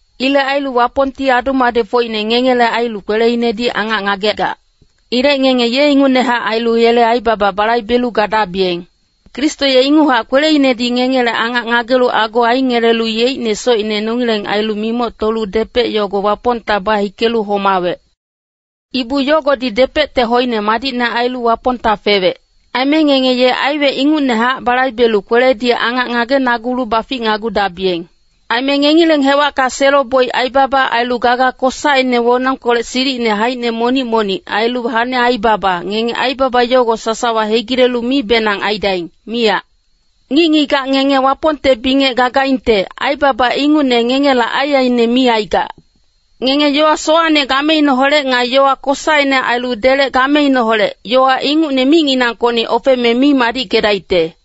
Ilec ailu Wapongti adu-madecfocine ngengele ailu kweleinedi angac ngagegac. Ilec ngenge ye ingucnehac ailu yele aibaba balaibelu gadabiyeng. Kristo ye inguchac kweleinedi ngengele angac ngagelu ago aingelelu yeicne socine nongileng ailu mimoctolu depec yogo Wapongta bahikelu homawec. Ibu yogodi depecte hoine madicne ailu Wapongta fewec. Aime ngenge ye aiwec ingucnehac balaibelu kweledi angac ngagenagulu baficnagudabiyeng. Aime ngengileng hewacka selo-boic aibaba, ailu gaga kosaine wonongkolec silicine haicine monic-monic, ailu hane aibaba, ngenge aibaba yogo sasawa hegilelu mibenang aidaing, miyac. Ngic-ngigac ngenge Wapongte bingec gagaingte, aibaba ingucne ngengela aiaiine mi aigac. Ngenge yowa sowacne gameineholec nga yowa kosaine ailu delec gameineholec, yowa ingucne micnginangkocni ofeme mi madickedaicte.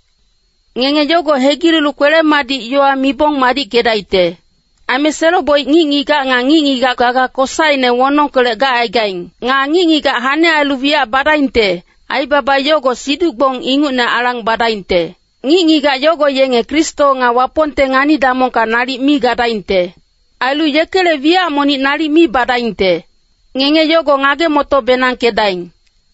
Ngenge yogo hegilelu kwele-madic yowa mibong madickedaicte. Aime selo-boic ngic-ngigac nga ngic-ngigac gaga kosaine wonongkolec gacaigaing. Nga ngic-ngigac hane ailu wiyac badaingte, aibaba yogo siduc-gbong ingucne alang badaingte. Ngic-ngigac yogo yenge Kristo nga Wapongte ngani-damongka nalic mi gadaingte. Ailu yekele wiyac monic nalic mi badaingte. Ngenge yogo ngage-moto-benangkedaing.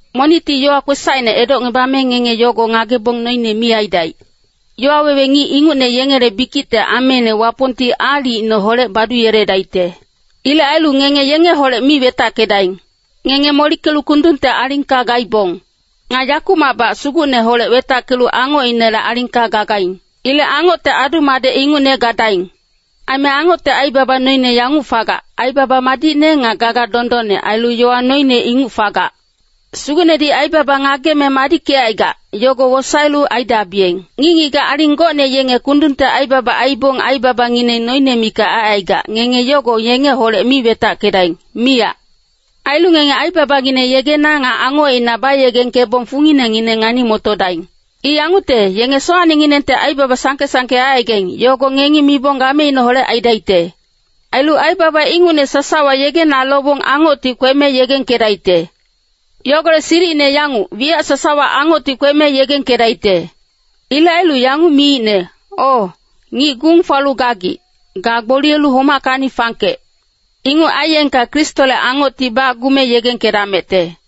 Monicti yowa kwesacine edocngebame ngenge yogo ngagebong noine mi aidaic. Yowa wewe ngic ingucne yengele bikicte ameine Wapongti aalicineholec baduyeledaicte. Ilec ailu ngenge yengeholec mi wetackedaing. Ngenge molickelu kundungte alingka gaibong. Nga yakumacbac Sugucneholec wetackelu angocinele alingka gagaing. Ilec angocte adu-madec ingucne gadaing. Aime angocte aibaba noine yanguc fagac, aibaba madicne nga gaga dondonne, ailu yowa noine inguc fagac. Sugucnedi aibaba ngageme madickecaigac, yogo wosaelu aidabiyeng. Ngic-ngigac aling gocne yenge kundungte aibaba aibong aibabangineng noine mikac aicaigac, ngenge yogo yengeholec mi wetackedaing, miyac. Ailu ngenge aibabangineng yegena nga angocina bayegengkebong funginengineng ngani-motodaing. I yangucte, yenge sowacnenginengte aibaba sangke-sangke aicaigaing, yogo ngengi mibong gameineholec aidaicte. Ailu aibaba ingucne sasawa yegena lobong angocti kweme yegengkedaicte. Yogolec silicine yanguc, wiyac sasawa angocti kweme yegengkedaicte. Ilec ailu yanguc miicne, “O, ngic gung falu gagic, ga gboliyelu homackacni fangkec. Inguc aiyengka Kristole angocti bacgume yegengkedamecte.”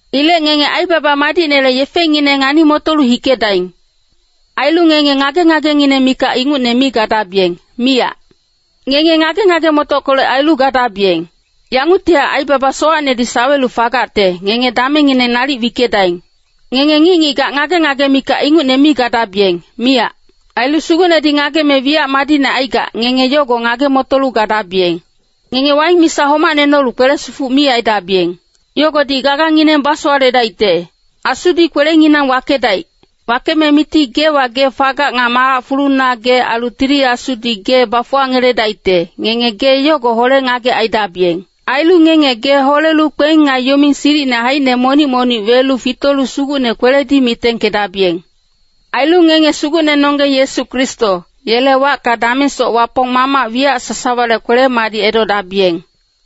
Ilec ngenge aibaba madicnele yefengineng ngani-motolu hikedaing. Ailu ngenge ngage-ngagengineng mikac ingucne mi gadabiyeng, miyac. Ngenge ngage-ngage-motockolec ailu gadabiyeng. Yanguctihac aibaba sowacnedi sawelu fagacte, ngenge damengngineng nalic wickedaing. Ngenge ngic-ngigac ngage-ngage mikac ingucne mi gadabiyeng, miyac. Ailu Sugucnedi ngageme wiyac madicne aigac, ngenge yogo ngage-motolu gadabiyeng. Ngenge waing misa homacne nolu kwele-sifuc mi aidabiyeng. Yogodi gagangineng basowaledaicte. Asudi kwelenginang wakedaic. Wakeme miti geewa gee fagac nga malac fuluna gee ailu Tili Asudi gee bafuwangeledaicte, ngenge gee yogo hole-ngagec aidabiyeng. Ailu ngenge gee holelu kpeng nga yoming silicine haicine monic-monic welu fitolu Sugucne kweledi mitengkedabiyeng. Ailu ngenge Sugucnenonggeng Yesu Kristo, yele wacka damengsoc Wapong Mamac wiyac sasawale kwele-madic edodabiyeng.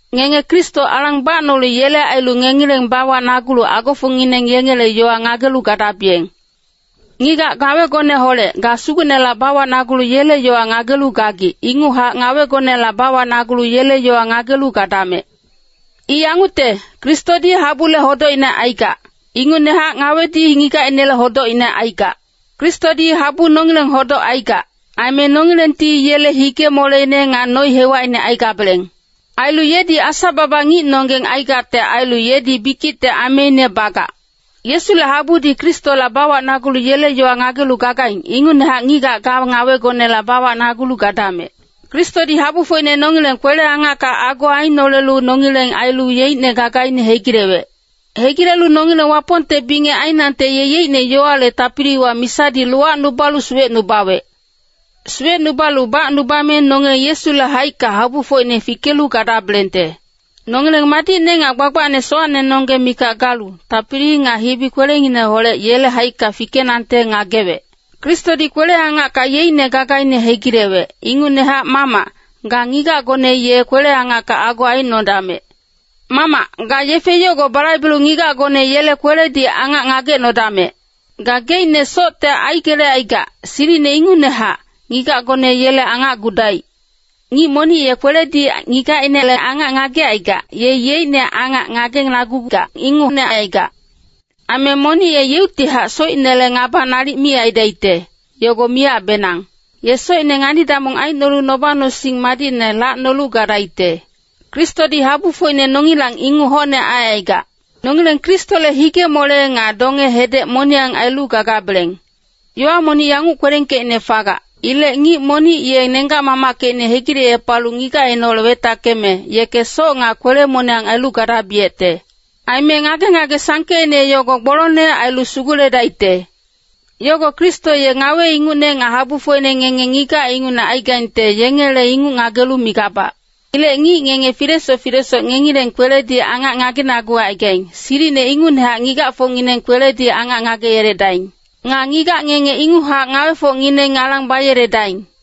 Ngenge Kristo alang bacnolu yele ailu ngengileng bawacnagulu agofocngineng yengele yowa ngagelu gadabiyeng. Ngigac ngawegoneholec, ga Sugucnela bawacnagulu yele yowa ngagelu gagic, inguchac ngawegonela bawacnagulu yele yowa ngagelu gadamec. I yangucte, Kristodi habule hodocine aigac, ingucnehac ngawedi ngigacinele hodocine aigac. Kristodi habu nongileng hodoc aigac, aime nongilengti yele hige-moleine nga noi-hewacine aigabeleng. Ailu yedi Asa-baba ngicnonggeng aigacte ailu yedi bikicte ameine bagac. Yesule habudi Kristola bawacnagulu yele yowa ngagelu gagaing, ingucnehac ngigac ga ngawegonela bawacnagulu gadamec. Kristodi habufocine nongileng kwele-angacka ago ainolelu nongileng ailu yeicne gagaine hegilewec. Hegilelu nongileng Wapongte bingec ainangte ye yeicne yowale tapiliwa misadi lowacnubalu suwecnubawec. Suwecnubalu bacnubame nongileng Yesule haicka habufocine fikelu gadabelengte. Nongileng madicne nga gbagbacne sowacnenonggeng mikac galu, tapili nga hibi-kwelengngineholec yele haicka fikenangte ngagewec. Kristodi kwele-angacka yeicne gagaine hegilewec, ingucnehac mamac, ga ngigacgone ye kwele-angacka ago aicnodamec. Mamac, ga yefe yogo balaibelu ngigacgone yele kweledi angac ngagecnodamec. Gageicne socte aigelecaigac, silicine ingucnehac, ngigacgone yele angacgudaic. Ngic monic ye kweledi ngigacinele angac ngagecaigac, ye yeicne angac ngagenagugac ingucne aigac. Aime monic yeuctihac socinele ngaba nalic mi aidaicte, yogo miyacbenang. Ye socine ngani-damong aicnolu noba-nosing madicne lacnolu gadaicte. Kristodi habufocine nongilang inguc hocne aicaigac. Nongileng Kristole hige-mole nga donge-hedec moniyang ailu gagabeleng. Yowa monic yanguc kwelengkeicne fagac, “Ilec ngic monic ye nenggac-mamackecine hegilecepalu ngigacineholec wetackeme, yeke soc nga kwele-moniyang ailu gadabiyecte.” Aime ngage-ngage sangkeicne yogo gbolongne ailu suguledaicte. Yogo Kristo ye ngawe ingucne nga habufocine ngenge ngigac ingucne aigaingte yengele inguc ngagelu migabac. Ilec ngic ngenge filesoc filesoc ngengileng kweledi angac ngagenagucaigaing, silicine ingucnehac ngigacfocngineng kweledi angac ngageyeledaing. Nga ngigac ngenge inguchac ngawefocngineng alang bayeledaing.